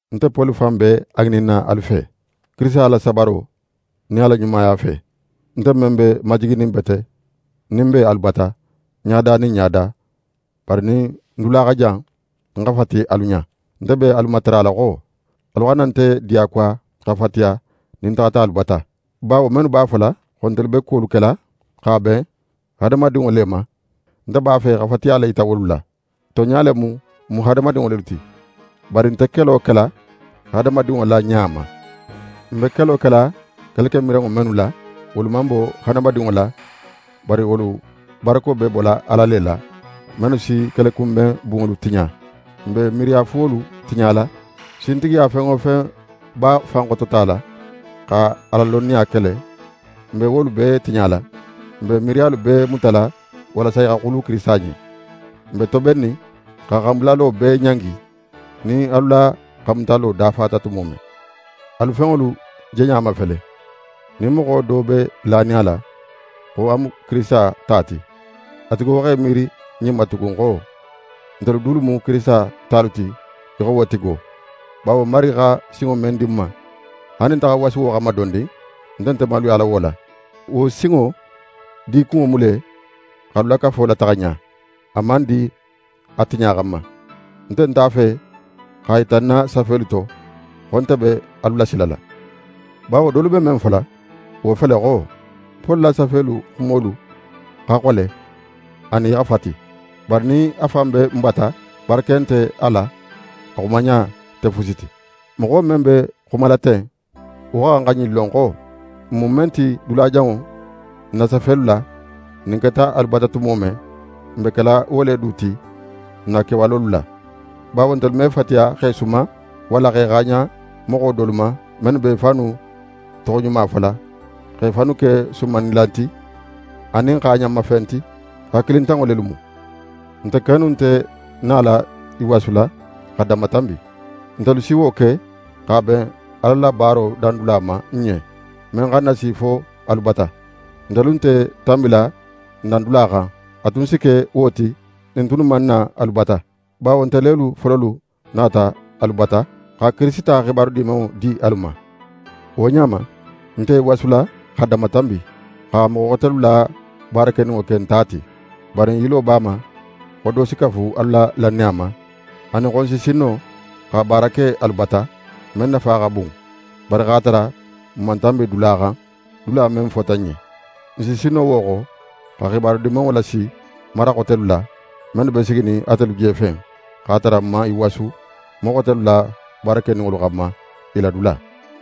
Nte Poli fan be a ŋininna alu fe, Kirisita la sabaro nin a la ɲumaya fe, nte men be majiginin bete nin n be alu bata, ɲada nin ɲada; bari nin ń dula xa jan, ń xa fati alu ɲa, nte be alu matarala xo: Alu xana nte diyakuwa xa fatiya nin ń taxata alu bata. Bawo mennu b'a fola xo ntelu be kuwolu kela x'a ben hadamadinŋo le ma, nte b'a fe xa fatiya le yita wolu la. Tonɲa le mu, n mu hadamadinŋo lelu ti, bari n nte kelo kela hadamadinŋo la ɲa ma. N be kelo kela kelekemiranŋo mennu la, wolu man bo hadamadinŋo la, bari wolu barako be bola Ala le la, mennu si kelekunben bunŋolu tiɲa. N be miiriyafuwolu tiɲala. Sintigiya fen wo fen b'a fan xototala, xa Ala lonniya kele, n be wolu bee tiɲala. N be miiriyalu bee mutala walasa i xa xulu Kirisita ɲen. N be tobennin xa xanbulalo bee ɲangi, nin alu la xanmutalo dafata tumo men. Alu fenŋolu jeɲa mafele. Nin moxo do be lanin a la xo a mu Kirisita ta ti, a tigo x'é miiri ɲin ma tugun xo: Ntelu dulu mu Kirisita talu ti í xo wo tigo. Bawo Marigi xa sinŋo men di n ma, haali nin nte xa ń wasu wo xanma dondin, nte nte maluyala wo la. Wo sinŋo dikunŋo mu le x'alu la kafo lataxa ɲa, a man di a tiɲa xanma. Nte nt'a fe x'a yita ń na safelu to xo nte be alu lasilala. Bawo dolu be men fola, wo fele xo: «Poli la safelu xumolu xa xole anin i xa fati; bari nin a fan be n bata, barake nte a la, a xumaɲa nte fusi ti.» Moxo men be xumala ten, wo xa xan ɲin lon xo: N mu men ti dulajanŋo n na safelu la, nin n keta alu bata tumo men, n be kela wo le du ti n na kewalolu la. Bawo ntelu me fatiya x'e suman, walla x'e xaaɲan moxo dolu ma, mennu be i fannu toxoɲuma fola, x'e fannu ke sumannilan ti, anin xaaɲanma fen ti. Hakilintanŋo lelu mu. Nte kennu nte nala i wasula xa danmatanbi. Ntelu si wo ke x'a ben Ala la baaro dandula ma n ɲen, men xa n nasi fo alu bata. Ntelu nte tanbila n dandula xan, a tun si ke wo ti nin n tunnu man na alu bata. Bawo nte lelu fololu nata alu bata xa Kirisita xibaru Dimanŋo di alu ma. Wo ɲa ma, n nte i wasula xa danmatanbi, xa moxo xotelu la baarakeninŋo ke n ta ti. Bari n yilo b'a ma xo do si kafu alu la lannaya ma, anin xo n si sin no xa baara ke alu bata, men nafa xa bun, bari x'a tara n man tanbi dula xan, dula men fota n ɲen. N si sin no wo xo, xa Xibaru Dimanŋo lasi mara xotelu la, mennu be siginin atelu jefen, x'a tara n man i wasu moxo xotelu la baarakeninŋolu xanma i la dula.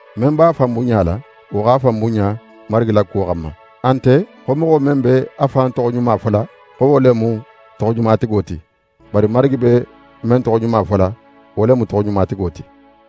Men b'a fan bunɲala, wo x'a fan bunɲa Marigi la kuwo xanma. A nte xo moxo men be a fan toxoɲuma fola xo wo le mu toxoɲumatigo ti, bari Marigi be men toxoɲuma fola, wo le mu toxoɲumatigo ti.